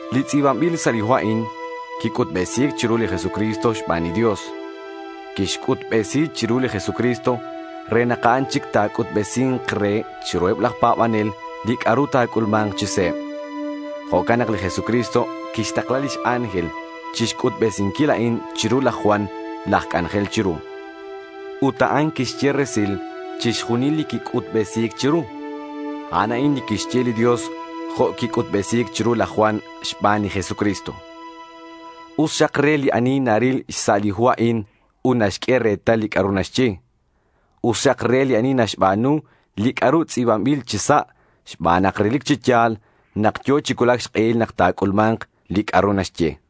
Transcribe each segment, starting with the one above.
Li tz'i̱banbil sa' li hu a'in quic'utbesi̱c chiru li Jesucristo xban li Dios. Quixc'utbesi chiru li Jesucristo re nak a'an chic ta̱c'utbesi̱nk re chiruheb laj pa̱banel li c'a'ru ta̱c'ulma̱nk chi se̱b. Jo'can nak li Jesucristo quixtakla lix ángel chixc'utbesinquil a'in chiru laj Juan laj c'anjel chiru. Ut a'an quixye resil chixjunil li quic'utbesi̱c chiru. A'an a'in li quixye li Dios jo' quic'utbesi̱c chiru laj Juan xban li Jesucristo. Us xak re li ani naril xsa' li hu a'in ut naxq'ue retal li c'a'ru naxye. Us xak re li ani naxba̱nu li c'a'ru tz'i̱banbil chi sa' xban nak relic chi ya̱l nak yo̱ chi cuulac xk'ehil nak ta̱c'ulma̱nk li c'a'ru naxye.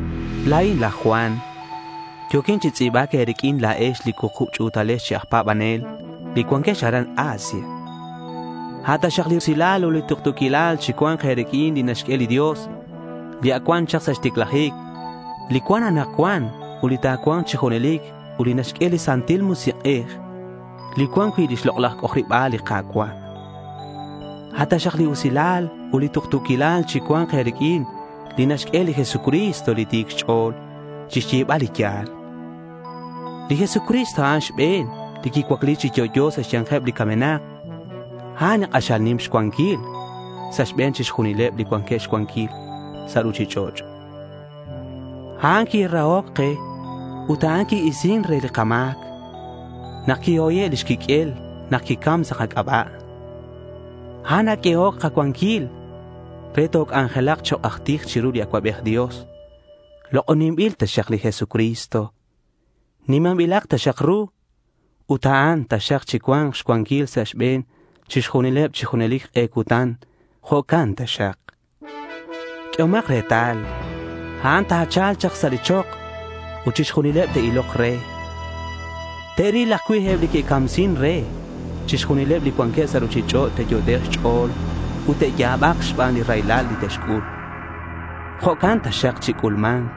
La̱in laj Juan. Yo̱quin chi tz'i̱bac e̱riq'uin la̱ex li cuukub ch'u̱talex chi aj pa̱banel li cuanquex aran Asia. A' taxak li usilal ut li tuktu̱quilal chi cua̱nk e̱riq'uin li naxq'ue li Dios li ac cuan chak sa' xticlajic, li cuan anakcuan, ut li cua̱nk chi junelic, ut li naxq'ue li Santil Musik'ej li cuan cui' lix lok'laj c'ojariba̱l li Ka̱cua'. A' taxak li usilal ut li tuktu̱quilal chicua̱nk e̱riq'uin li naxq'ue li Jesucristo li ti̱c xch'o̱l chixyebal li ya̱l. Li Jesucristo a'an li xbe̱n li quicuacli chi yo'yo sa' xya̱nkeb li camenak. A'an li k'axal nim xcuanquil sa' xbe̱neb chixjunileb li cuanqueb xcuanquil sa' ruchich'och'. A'an quirahoc ke ut a'an qui-isin re li kama̱c nak quihoye' lix quiq'uel nak quicam sa' kac'aba'. A'an naq'uehoc kacuanquil re toc'anjelak chok' aj tij chiru li Acuabej Dios. Lok'oninbil taxak li Jesucristo. Nimanbilak taxak ru ut a'an taxak chicua̱nk xcuanquil sa' xbe̱n chixjunil chi junelic k'e cutan. Jo'can taxak. Q'uehomak retal. A'an ta̱cha̱lk chak sa' li chok ut chixjunileb te'ilok re. Te'ril ajcui' eb li que'camsin re. Chixjunileb li cuanqueb sa' ruchich'och' te'yot'ek' xch'o̱l ut te'ya̱bak xban li raylal li te'xc'ul. Jo'can taxak chic'ulma̱nk.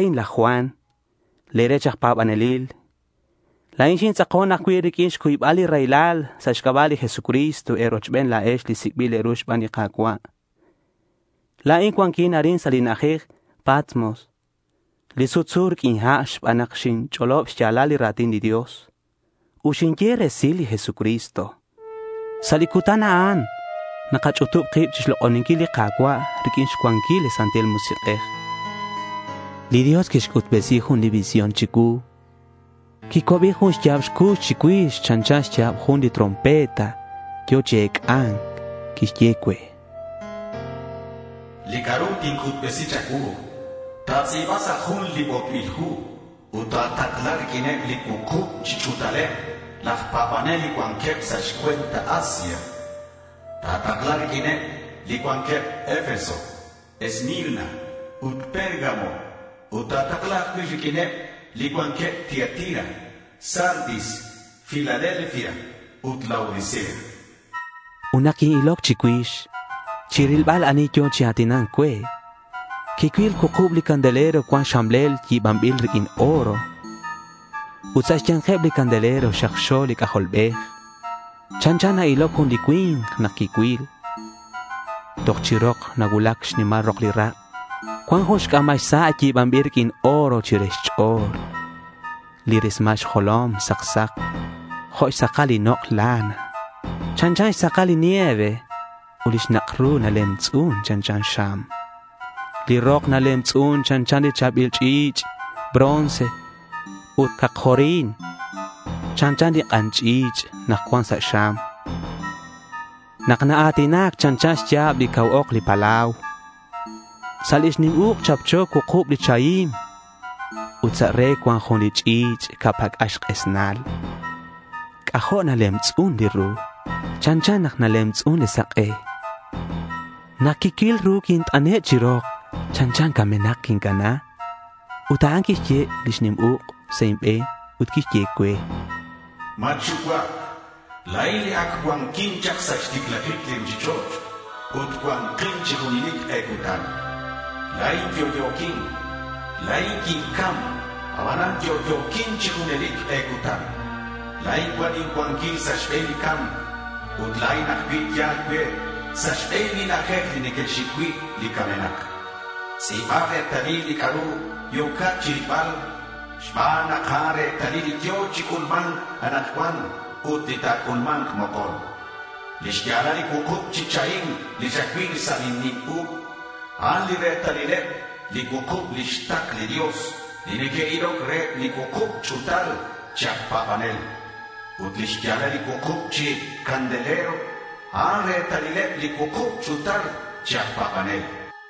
La̱in laj Juan, le̱ rech aj pa̱banelil. La̱in xintz'akon ajcui' riq'uin xcuybal li raylal sa' xc'aba' li Jesucristo e̱rochben la̱ex li sic'bil e̱ru xban li Ka̱cua'. La̱in cuanquin arin sa' li na'ajej Patmos li sutsu riq'uin ha' xban nak xinch'olob xya̱lal li ra̱tin li Dios ut xinye resil li Jesucristo. Sa' li cutan nak nakach'utub kib chixlok'oninquil li Ka̱cua', riq'uin xcuanquil li Santil Musik'ej, li Dios quixc'utbesi jun li visión chicuu. Quicuabi jun xya̱b cux chicuix. Chanchan xya̱b jun li trompeta yo̱ chi ec'a̱nc. Quixye cue: —Li c'a'ru tinc'utbesi cha̱cuu ta̱tz'i̱ba sa' jun li botbil hu ut ta̱takla riq'uineb li cuukub ch'u̱taleb laj pa̱banel li cuanqueb sa' xcue̱nt Asia. Takla riq'uineb li cuanqueb Efeso, Esmirna, ut Pérgamo. Ut ta̱takla ajcui' riq'uineb li cuanqueb Tiatira, Sardis, Filadelfia ut Laodicea, chan. Ut nak quin-iloc chicuix chirilbal ani yo̱ chi a̱tina̱nc cue, quicuil cuukub li candelero cuan xxamlel yi̱banbil riq'uin oro. Ut sa' xya̱nkeb li candelero xakxo li C'ajolbej. Chanchan na-iloc jun cui̱nk nak quicuil. Toj chi rok nacuulac xnimal rok li rak'. Cuan jun c'a̱mal sa' yi̱banbil riq'uin oro chire xch'o̱l. Li rismal xjolom sak sak jo' xsakal li nok' lana. Chanchan xsakal li nieve. Ut lix nak' ru nalemtz'un chanchan xam. Li rok nalemtz'un chanchan li cha̱bil ch'i̱ch' bronce ut cakjorin chanchan li k'an ch'i̱ch' nak cuan sa' xam. Nak naa̱tinac chanchan xya̱b lix cau ok li palau. Sa' lix nim uk' chapcho cuukub li chahim. Ut sa' re cuan jun li ch'i̱ch' ca' pac'al xk'esnal. C'ajo' nalemtz'un li ru. Chanchan nak nalemtz'un li sak'e. Nak quicuil ru quint'ane' chi rok. Chanchan camenak quincana. Ut a'an quixq'ue lix nim uk' sa' inbe̱n ut quixye cue: —Matxucuac. La̱in li ac cuanquin chak sa' xticlajic li ruchich'och' ut cua̱nkin chi junelic k'e cutan. La̱in yo'yo̱quin. La̱in quincam, abanan yo'yo̱quin chic chi junelic k'e cutan. La̱in cuan incuanquil sa' xbe̱n li ca̱mc. Ut la̱in ajcui' yal cue sa' xbe̱n li na'ajej li neque'xic cui' li camenak. Tz'i̱ba retalil li c'a'ru yo̱cat chirilbal xban nak a'an retalil li yo̱ chi c'ulma̱nc anakcuan ut li ta̱c'ulma̱nk mokon. Lix ya̱lal li cuukub chi chahim li xacuil sa' lin nim uk', a'an li retalileb li cuukub lix takl li Dios li neque'iloc reheb li cuukub ch'u̱tal chi aj pa̱banel. Ut lix ya̱lal li cuukub chi candelero, a'an retalileb li cuukub ch'u̱tal chi aj pa̱banel.